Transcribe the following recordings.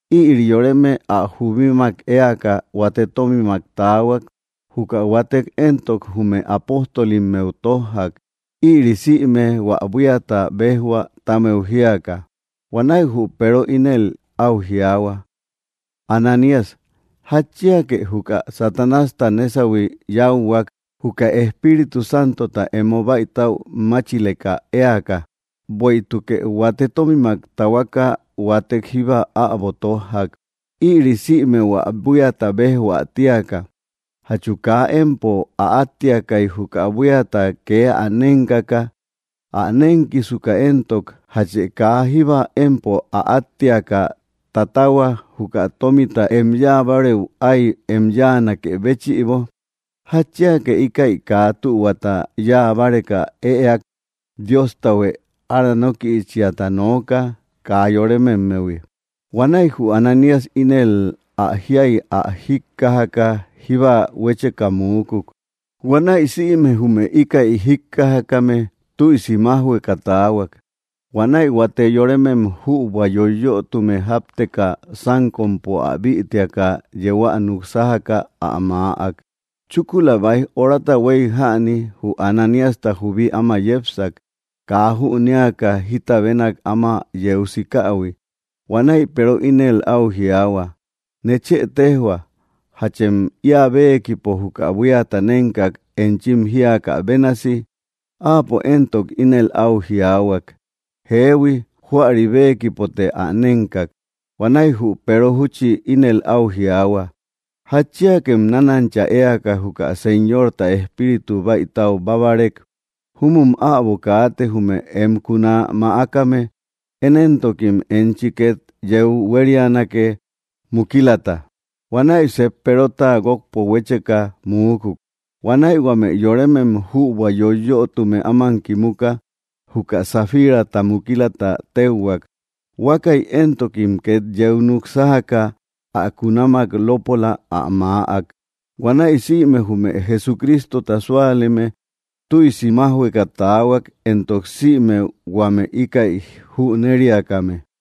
Ïri yoreme ä jubímak éaka huate tómimak taahuak, juka huatek éntok, jume apóstolimmeu tójjak, ïri sïme hua buíata bejhua ti ámeu jíaka. Huanäi jü Peero ínel au jiaahua: —Ananías, ¿jatchíake juka Satanásta nésauhui yáuhuak juka Espíritu Santota emo bäitäu máchileka éaka? Bueïtukë huate tómimak tahuaka huátek jíba äbo tójjak, ïri sïme hua buíata bejhua tíaka. ¿Jatchu kaa empo ä átteakai juka buíata ke ä nénkaka? Ä nénkisuka éntok, ¿jatchë kaa jíba empo ä átteaka tatahua juka tómita, em yáa bárëu ái em yáanakë béchïbo? ¿Jatchíake íkäi kaa tühuata yáa báreka ëak? Dióstahuë aranókïchiata nooka, kaa yorémemmehui. Huanäi jü Ananías ínel ä jiai ä jíkkajaka jíba, huécheka muúkuk. Huanäi sïme jume íkäi jíkkajakame tüisi májhueka taahuak. Huanäi huate yorëmem jübua yoyötume jápteka, sánkompo ä bïtiaka yéä nuksájaka ä maäk. Chúkula baij orata huei jäni jü Ananíasta jubí áma yépsak, kaa jünéaka jita bénak áma yeu sikähui. Huanäi Peero ínel au jiaahua: —Nechë tejhua, ¿jachem ia béekipo juka buíata nénkak enchim jíakä bénasi? Áapo éntok inel au jiaahuak: —Jeehui, júäri béekipote ä nénkak. Huanäi jü Peero júchi ínel au jiaahua: —¿Jatchíakem nánancha éaka juka Señorta Espíritu baítáu bábarek? Júmum äbo kaate jume em kuná mäákame. Én éntokim enchi ket yeu huérianake mukílata. Huanäi seep Perota guokpo huécheka muúkuk. Huanäi huame yorémem jübua yoyötume áman kimuka, juka Safírata mukílata téuhuak. Huákäi éntokim ket yeu núk sájaka ä kunamak lópola ä maäak. Huanäi sïme jume Jesucrístota súaleme tüisi májhueka taahuak, éntok sïme huame íkäi jünériakame.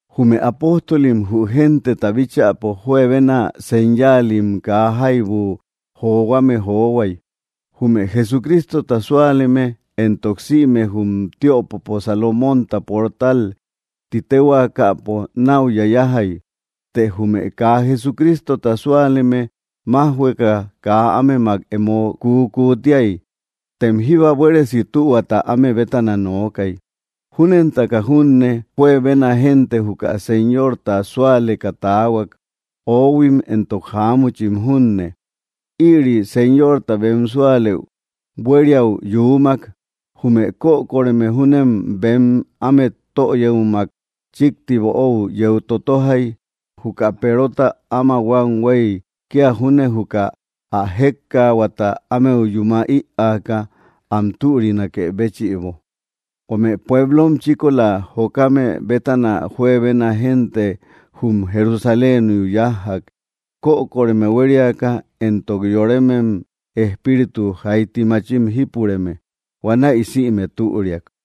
Jume apóstolim jü genteta bíchäpo juebenna señáalim kaa jaibu johuame johuai. Jume Jesucrístota súaleme éntok, sïme, jum tiöpopo Salomonta portal titéhuaakapo nau yayajjai. Të jume kaa Jesucrístota súaleme májhueka kaa ámemak emo kuúkuútiai, tem jíba buéresi tühuata áme bétana nookai. Júnentaka junne juebena génte juka Señorta súaleka taahuak, oóhuim éntok jaámuchim junne. Ïri Señorta bem súalëu buériau yuumak. Jume kökoreme júnem bem ámet töyëumak chikti böóu yeu totojjai, juka Perota áma huam huei kia júne juka ä jékkaahuata ámeu yúma ïaaka am türinakë béchïbo. Huame pueblom chíkola jokame bétana juebena génte jum Jerusaléniu yájjak, kökoreme huériaka, éntok yoremem espíritu jaiti machim jípureme. Huanäi sïme türiak.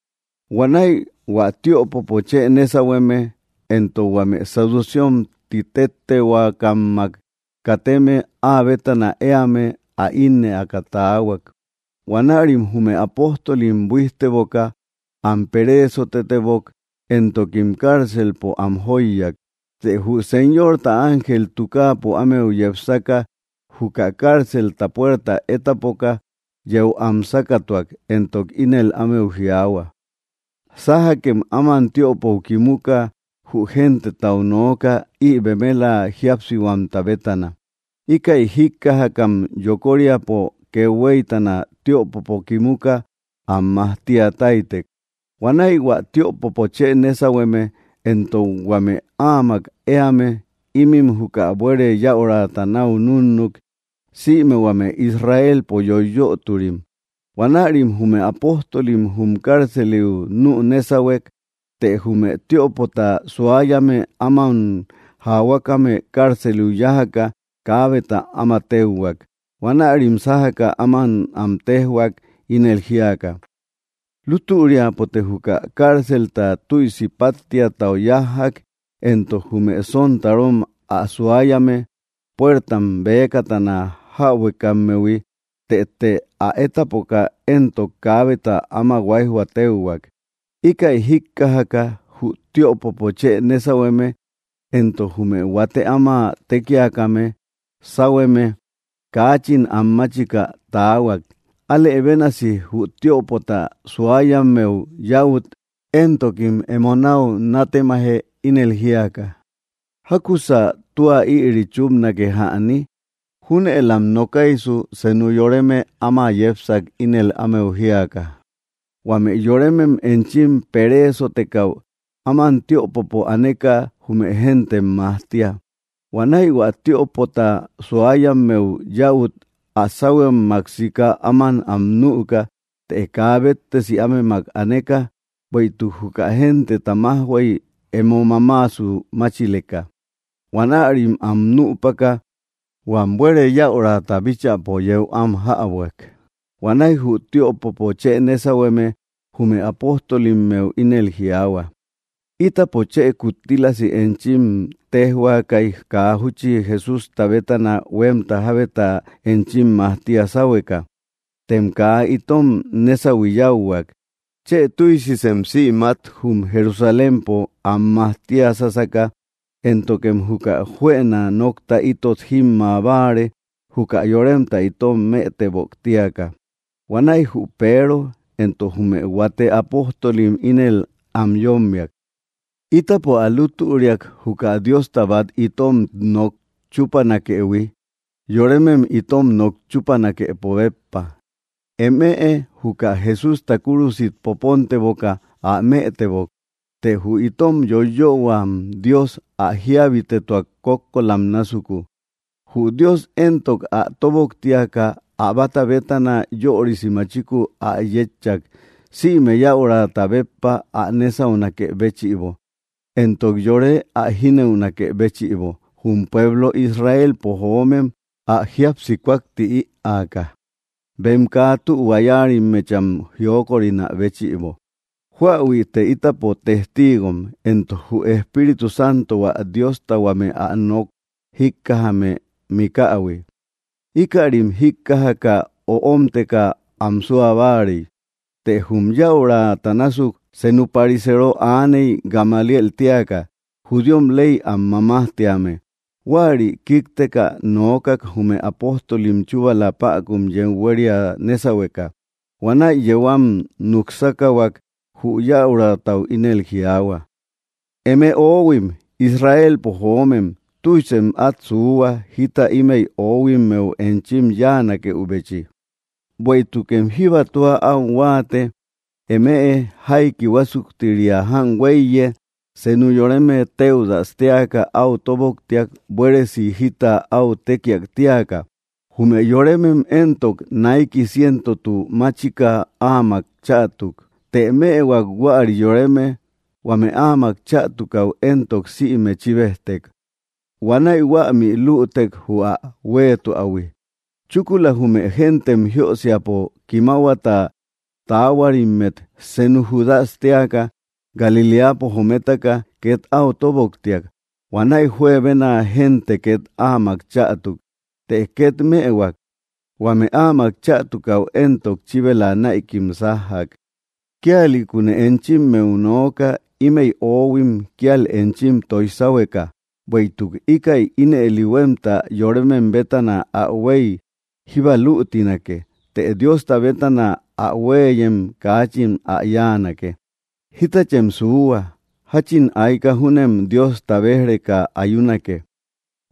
Huanäi hua tiöpopo chë nésauhueme, éntok huame saducéom titéhuaakammak kateme, áa bétana éame, ä ínnëaka taahuak. Huanärim jume apóstolim buíjteboka am peréesotetebok, éntokim cárcelpo am jóiyak. Të jü Señorta ángel tukaapo ámeu yepsaka, juka cárcelta puerta étapoka, yeu am sákatuak, éntok ínel ámeu jiaahua: —Sájakem áman tiöpou kimuka jü gentetau nooka ï bemela jíapsihuamta bétana. Íkäi jíkkajakam yokóriapo kethuéitana tiöpopo kimuka am majtíataitek. Huanäi hua tiöpopo chë nésauhueme, éntok huame áamak éame, ímin juka buere yäurata nau núnnuk, sïme huame Israelpo yoiyöturim. Huanärim jume apóstolim jum cárceliu nuú nésauhuek. Të jume tiöpota suáyame áman jaahuákame cárceliu yájaka kaábeta áma téuhuak. Huanärim sájaka áman am téjhuak, ínel jíaka: —Lútüriapote juka cárcelta tüisi páttiatau yájjak, éntok jume sontarom ä suáyame puértam bëkatana jäbuekammehui. Tëte ä étapoka éntok, kaábeta áma huáijhua téuhuak. Íkäi jíkkajaka jü tiöpopo chë nésauhueme, éntok jume huate áma tékiakame sáuhueme, kaachin anmáchika taahuak, álë bénasi jü tiöpota suáyammeu yäut, éntokim emo nau nátemaje ínel jíaka: —¿Jákusa tua ïri chúpnake jäni? Júnëlam nokaisu senú yoreme áma yépsak ínel ámeu jíaka: —Huame yorémem enchim pereesotekäu áman tiöpopo aneka jume géntem majtíay. Huanäi hua tiöpota suáyammeu yäut ä sáuhuëummak sika áman am nüka, të kaa béttesi ámemak aneka, bueïtuk juka genteta májhuey emo mamaasu máchileka. Huanärim am nüpaka huam buere yäurata bíchäpo yéu am jäbuak. Huanäi jü tiöpopo chë nésauhueme jume apóstolimmeu ínel jiaahua: —Ítapo chë, kuttílasi enchim téjhuaakai kaa júchi Jesústa bétana huemta jábeta enchim majtía sáhueka. Tem kaa itom nésauhui yáuhuak. Chë tüisisem sïmát jum Jerusalémpo am majtiasasaka, éntokem juka juëna nokta itot jimma báare juka yoremta itom mëtebok tíaka. Huanäi jü Peero éntok jume huate apóstolim ínel am yómmiak: —Ítapo ä lútüriak juka Diosta bat itom nok chúpanakëhui yorémem itom nok chúpanakepo béppa. Eme juka Jesústa kúrusit popónteboka ä mëtebok, të jü itom yoiyöhuam Dios ä jíabitetuak kókkolam násuku. Jü Dios éntok, ä tóboktiaka ä bata bétana yörisi machiku ä yétchak, sïme yäurata béppa ä nésaunakë béchïbo, éntok yore ä jínëunakë béchïbo, jum pueblo Israelpo jömem ä jíapsi kúakti ïaaka, bem kaa tühua yáarimmecham jiókorinä béchïbo. Júahuïte ítapo testíigom, éntok jü Espíritu Santo, hua Diosta huame ä nok jíkkajame mikähui. Íkärim jíkkajaka, öómteka am sua báarei. Të jum yäurata násuk senú pariseero aaney Gamaliél téaka, judíom ley am mamájtíame. Huäri kíkteka noókak jume apóstolim chúbala päkun yeu huéria nésauhueka. Huanäi yéu am nuksákahuak, jü yäuratau ínel jiaahua: —Eme oóhuim Israelpo joomem, tüisem at suuhua jita ímëi oohuimmeu enchim yáanakëubechi. Bueïtukem jíba tua au huáate eme, jaiki huásuktiria jan huéiye senu yoreme Téudas téaka au tóboktiak buéresi jita au tékiak tíaka. Jume yoremem éntok, naiki cientotu máchika áamak chätuk. Të mëhuak huäri yoreme, huame áamak chätukäu éntok, sïme chíbejtek. Huanäi huämi luútek jü ä huéetuähui. Chúkula jume géntem jiösiapo kimahuata taahuarimmet senu Júdas téaka, Galiléapo jométaka, ket au tóboktiak. Huanäi juebena génte ket áamak chätuk. Të ket mëhuak, huame áamak chätukáu éntok, chíbela näikim sájjak. Kíalïkune enchimmeu nooka ímëi oóhuim kíal enchim toij sáhueka. Bueïtuk íkäi ínëli huemta yorémem bétana ä huei, jíba luutínake; të Diosta bétana ä huéeyem kaachin ä yáanake. Jítachem suuhua; jachin aika júnem Diosta béj‑reka ayúnake.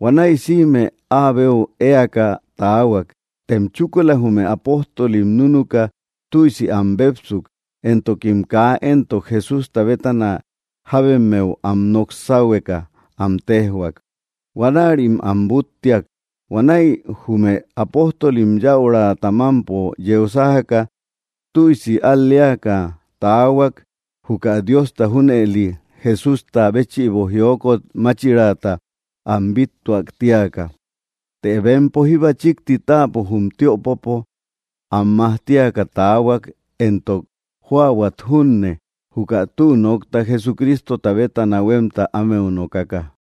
Huanäi sïme áa beu éaka taahuak. Tem chúkula jume apóstolim núnuka tüisi am bépsuk, éntokim kaa éntok Jesústa bétana jábemmeu am nók sáhueka am téjhuak. Huanärim am búttiak. Huanäi jume apóstolim yäurata mampo yeu sájaka, tüisi al‑léaka taahuak juka Diosta junëli Jesústa béchïbo jiókot máchirata am bíttuak tíaka. Të bempo jíba chikti táapo jum tiöpopo am majtíaka taahuak, éntok jóahuat junne, juka tü nokta Jesucrístota bétana huemta ámeu nokaka.